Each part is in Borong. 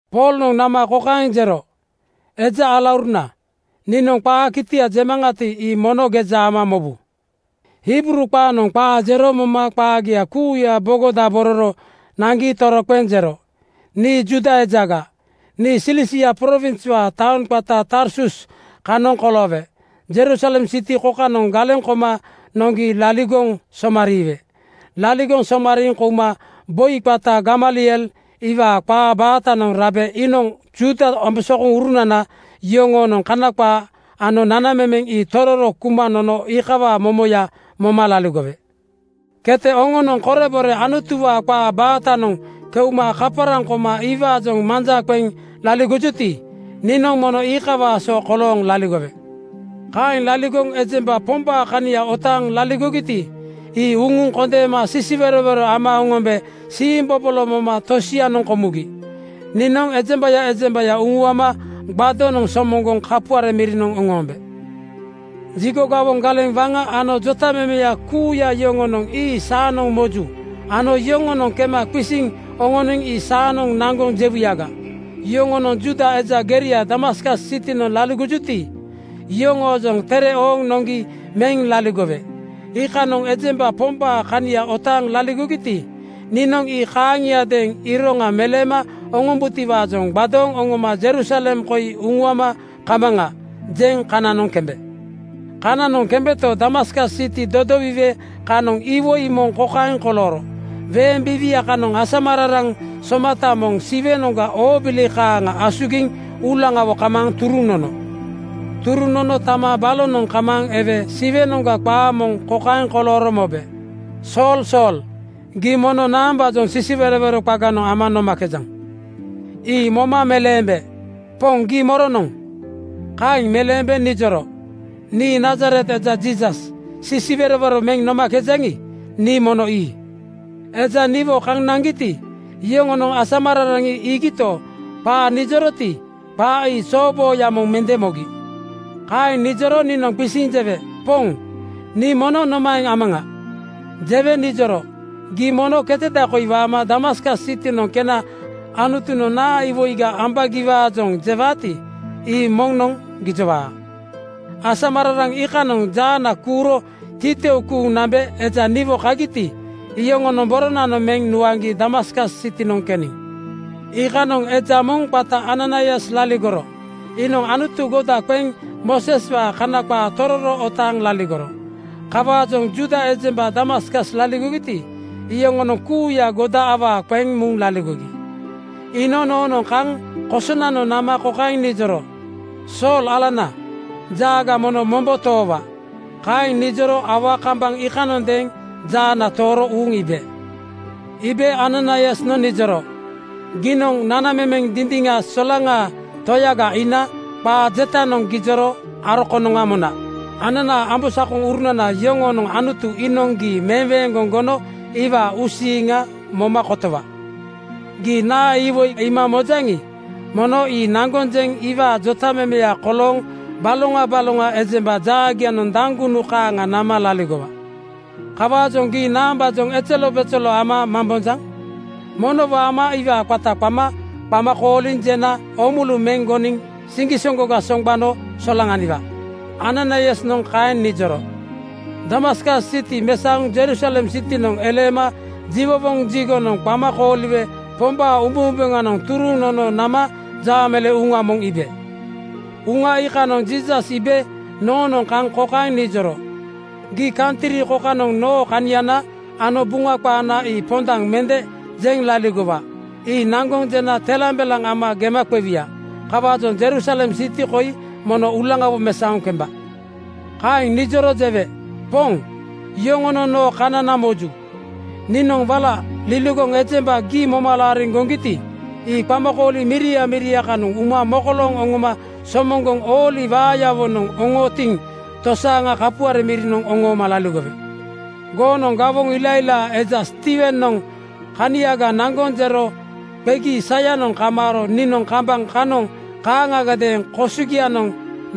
Poolnoŋ nama kokaeŋ jero, “Eja alauruna, niinoŋ qaa kitia jemaŋati, ii mono geja ama mobu.” Hibruu qaanoŋ qaa jero moma qaagia kuuya bogodabororo naŋgi toroqeŋ jero, “Nii Juuda ejaga. Nii Silisia prowinswaa taoŋ qata Tarsus kanoŋ koloowe Jerusalem siti kokanoŋ galeŋ koma noŋgi laligoŋ somariiwe. Laligoŋ somariiŋ kouma boi qata Gamaliel iwaa qaa baatanoŋ rabe iinoŋ Juuda ambosakoŋurunana yoŋoonoŋ Kana qaa ano nanamemeŋ ii tororo kuma nono iikawaa momoya moma laligowe. Kete oŋonoŋ korebore Anutuwaa qaa baatanoŋ keuma kaparaŋ koma iwaajoŋ manja qeŋ laligojuti, niinoŋ mono iikawaa so kolooŋ laligowe. Kaeŋ laligoŋ ejemba Pombaa kania otaaŋ laligogiti, ii uŋuŋ kondeema sisiwerowero ama oŋombe siimbobolo moma tosianoŋ komugi. Niinoŋ ejembaya ejembaya uŋuama gbadonoŋ (tape) somoŋgoŋ kapuare mirinoŋ oŋoombe. Jigo gawoŋ galeŋ waŋa ano jotamemeya kuuya yoŋonoŋ ii saanoŋ moju ano yoŋoonoŋ kema qisiŋ oŋoniŋ ii saanoŋ naŋgoŋ jewuyaga. Yoŋonoŋ Juuda eja geria Damaskas sitinoŋ laligojuti, iyoŋoojoŋ tere ooŋ noŋgi meŋ laligowe. Iikanoŋ ejemba Pombaa kania otaaŋ laligogiti, niinoŋ ii kaaŋiadeeŋ ‘Iroŋa meleema oŋombutiwaajoŋ gbadooŋ oŋoma Jerusalem koi uŋuama kamaŋa,’ jeŋ kananoŋ kembe.” “Kananoŋ kembeto, Damaskas siti dodowiwe kanoŋ iwoi moŋ kokaeŋ kolooro: Weeŋ biiwia kanoŋ asamararaŋ somata moŋ Siwenoŋga oobili kaaŋa asugiŋ uulaŋawo kamaaŋ turuŋ nono. Turuŋ nono tama balonoŋ kamaaŋ ewe Siwenoŋga qaa moŋ kokaeŋ kolooro mobe, ‘Sool Sool, gii mono naambaajoŋ sisiwerowero qaganoŋ ama nomakejaŋ?’ Ii moma meleembe, ‘Poŋ, gii moronoŋ?’ Kaeŋ meleembe nijoro, ‘Nii Nazaret eja Jiisas, sisiwerowero meŋ nomakejaŋi, nii mono ii.’ Eja niwo kaŋ naŋgiti, iyoŋonoŋ asamararaŋ ii iigito, qaa nijoroti, qaa ii zoobooya moŋ mende mogi. Kaeŋ nijoro niinoŋ qisiŋ jewe, ‘Poŋ, nii mono nomaeŋ amaŋa?’ Jewe nijoro, ‘Gii mono keteda koi waama Damaskas sitinoŋ kena Anutunoŋ naa iwoiga ambaagiwaajoŋ jewaati, ii moŋnoŋ gijowaa.’ Asamararaŋ iikanoŋ jaana kuuro titou kuuŋ nambe eja niwo kagiti, iyoŋonoŋ boronanoŋ meŋ nuaŋgi Damaskas sitinoŋ keniŋ. “Iikanoŋ eja moŋ qata Ananaias laligoro. Iinoŋ Anutu goda qeŋ Mooseswaanoŋ Kana qaa tororo otaaŋ laligoro. Kawaajoŋ Juuda ejemba Damaskas laligogiti, iyoŋonoŋ kuuya godaya awaa qeŋ muŋ laligogi. Iinoŋ noonoŋ kaŋ kosonanoŋ nama kokaeŋ nijoro, ‘Sool alana, jaaga mono mombo toowa.’ Kaeŋ nijoro aua kambaŋ iikanondeeŋ jaana tooro uuŋ iibe. Iibe Ananaiasnoŋ nijoro, ‘Giinoŋ nanamemeŋ dindiŋa solaŋaa Toyaga iina qaa jetanoŋ gijoro aro konoŋa mona. Ananaa ambosakonana yoŋoonoŋ Anutu iinoŋ gii meweeŋgoŋ gono iwaa uusiiŋa moma kotowa. Gii naa iwoi iima mojaŋi, mono ii naŋgoŋ jeŋ iwaa jotamemeya kolooŋ baloŋa baloŋa ejemba jaagianoŋ daŋgunu kaaŋa nama laligowa. Kawaajoŋ gii naambaajoŋ ezelobezelo ama mambonjaŋ? Mono waama iwaa qata qama qama kooliŋ jena oomulu meŋ goniŋ siŋgisoŋgoga soŋgbano solaŋaniwa.’ Ananaiasnoŋ kaeŋ nijoro.” “Damaskas siti mesaoŋ Jerusalem sitinoŋ eleema jiwowoŋ jigonoŋ qama kooliwe Pombaa umbeumbeŋanoŋ turuŋ nono nama jaameleeŋ uŋa moŋ iibe. Uŋa iikanoŋ Jiisas iibe noonoŋ kaŋ kokaeŋ nijoro, ‘Gii kantri kokanoŋ noo kaniana ano Buŋa qaana ii pondaŋ mende jeŋ laligowa. Ii naŋgoŋ jena telambelaŋ ama gema qewuya. Kawaajoŋ Jerusalem siti koi mono uulaŋawo mesaoŋ kemba.’ “Kaeŋ nijoro jewe, ‘Poŋ, yoŋonoŋ noo kanana moju. Niinoŋ wala liligoŋ ejemba gii moma laariŋ goŋgiti, ii qamakooli miria miria kanoŋ uma mokolooŋ oŋoma somoŋgoŋ ooli waayawonoŋ oŋootiŋ tosaaŋa kapuare mirinoŋ oŋooma laligowe. Goonoŋ gawoŋ ilailaa eja Stiiwenoŋ kaniaga naŋgoŋ jero qegi saya kamaaro niinoŋ kambaŋ kanoŋ kaaŋagadeeŋ kosogianoŋ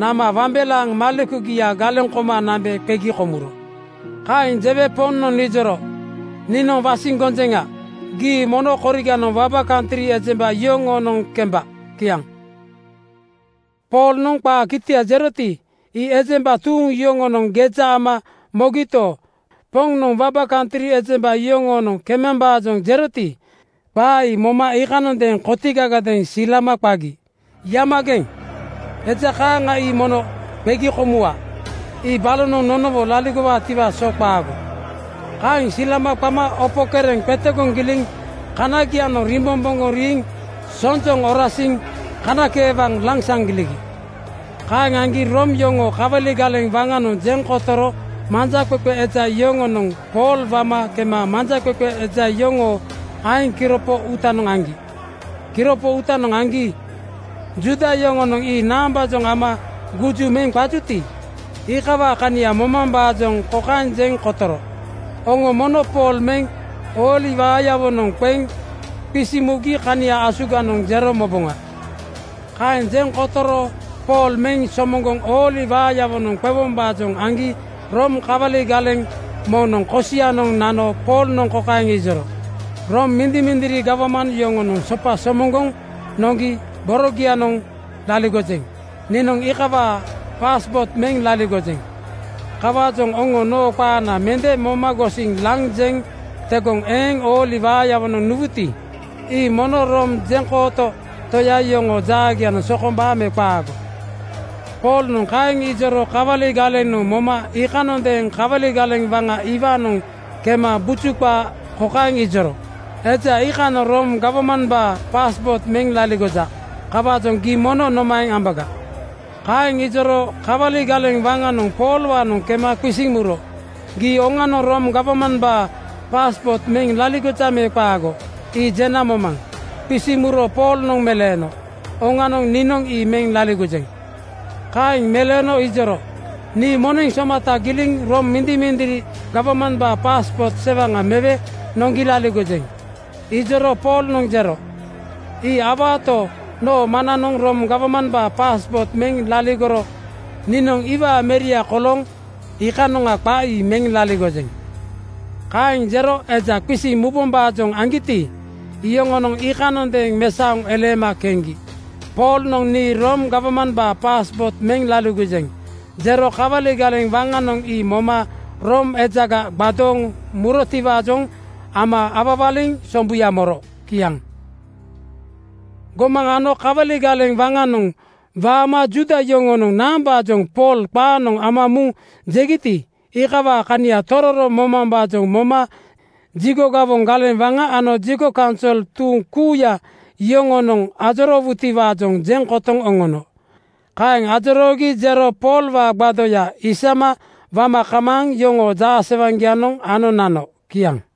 nama wambelaaŋ malekugia galeŋ koma nambe qegi komuro.’ Kaeŋ jewe Poŋnoŋ nijoro, ‘Niinoŋ wasiŋ gonjeŋa gii mono koriganoŋ waba kantri ejemba yoŋoonoŋ kemba.’ Kiaŋ.” Poolnoŋ qaa kitia jeroti, ii ejemba tuuŋ yoŋonoŋ geja ama mogito, (Poŋnoŋ waba kantri ejemba yoŋoonoŋ kemambaajoŋ jeroti,) qaa ii moma iikanondeeŋ kotigagadeeŋ silama qagi, “Yamageŋ! Eja kaaŋa ii mono qegi komuwa. Ii balonoŋ nonowo laligowaatiwaa so qaago.” Kaeŋ silama qama opo kereŋ qetegoŋ giliŋ (kanagianoŋ rimbomboŋgoŋ riiŋ) sonjoŋ orasiŋ kanakeewaŋ lansaŋ giligi. Kaeŋ aŋgi Room yoŋoo kawali galeŋ waŋanoŋ jeŋ kotoro manjaqeqe eja yoŋonoŋ Pool wama kema manjaqeqe eja yoŋoo aeŋ kiropo uutanoŋ aŋgi. Kiropo uutanoŋ aŋgi Juuda yoŋonoŋ ii naambaajoŋ ama guju meŋ qajuti, iikawaa kania momambaajoŋ kokaeŋ jeŋ kotoro, “Oŋo mono Pool meŋ ooli waayawonoŋ qeŋ qisiŋ mugi kania asuganoŋ jero moboŋa.” Kaeŋ jeŋ kotoroto, Pool meŋ somoŋgoŋ ooli waayawonoŋ qewombaajoŋ aŋgi Room kawali galeŋ moŋnoŋ kosianoŋ nano Poolnoŋ kokaeŋ ijoro, “Room mindimindiri gawman yoŋonoŋ sopa somoŋgoŋ noŋgi borogianoŋ laligojeŋ. Niinoŋ iikawaa (jeŋkooto) paaspoot meŋ laligojeŋ. Kawaajoŋ oŋo noo qaana mende moma gosiŋ laŋ jeŋ tegoŋ eeŋ ooli waayawonoŋ nuwuti, ii mono Room jeŋkooto toya yoŋoo jaagianoŋ sokombaa me qaago?” Poolnoŋ kaeŋ ijoro kawali galenoŋ moma iikanondeeŋ kawali galeŋ waŋa iwaanoŋ kema buju qaa kokaeŋ ijoro, “Eja iikanoŋ Room gawmambaa (jeŋkooto) paaspoot meŋ laligoja. Kawaajoŋ gii mono nomaeŋ ambaga?” Kaeŋ ijoro kawali galeŋ waŋanoŋ Poolwaanoŋ kema qisiŋ muro, “Gii oŋanoŋ Room gawmambaa (jeŋkooto) paaspoot meŋ laligojaŋ me qaago? Ii jena momaŋ.” Qisiŋ muro Poolnoŋ meleeno, “Oŋanoŋ, niinoŋ ii meŋ laligojeŋ.” Kaeŋ meleeno ijoro, “Nii moneŋ somata giliŋ Room mindimindiri gawmambaa (jeŋkooto) paaspoot sewaŋa mewe noŋgi laligojeŋ.” Ijoro Poolnoŋ jero, “Ii awaato, noo maŋnanoŋ Room gawmambaanoŋ paaspoot meŋ laligoro niinoŋ iwaa meria kolooŋ iikanoŋa qa ii meŋ laligojeŋ.” Kaeŋ jero eja qisiŋ mubombaajoŋ aŋgiti, iyoŋonoŋ iikanondeeŋ mesaoŋ eleema keŋgi. Poolnoŋ “Nii Room gawmambaa paaspoot meŋ laligojeŋ,” jero kawali galeŋ waŋanoŋ ii moma Room ejaga gbadooŋ murotiwaajoŋ ama awawaliŋ sombuya moro. Kiaŋ. Gomaŋ ano kawali galeŋ waŋanoŋ waama Juuda yoŋonoŋ naambaajoŋ Pool qaanoŋ ama muŋ jegiti, iikawaa kania tororo momambaajoŋ moma jigo gawoŋ galeŋ waŋa ano jigo kaunsol tuuŋ kuuya yoŋonoŋ ajoroowutiwaajoŋ jeŋ kotoŋ oŋono. Kaeŋ ajoroogi jero Poolwaa gbadoya (tape) isaŋgi wama kamaaŋ yoŋoo jaasewaŋgianoŋ ano nano. Kiaŋ.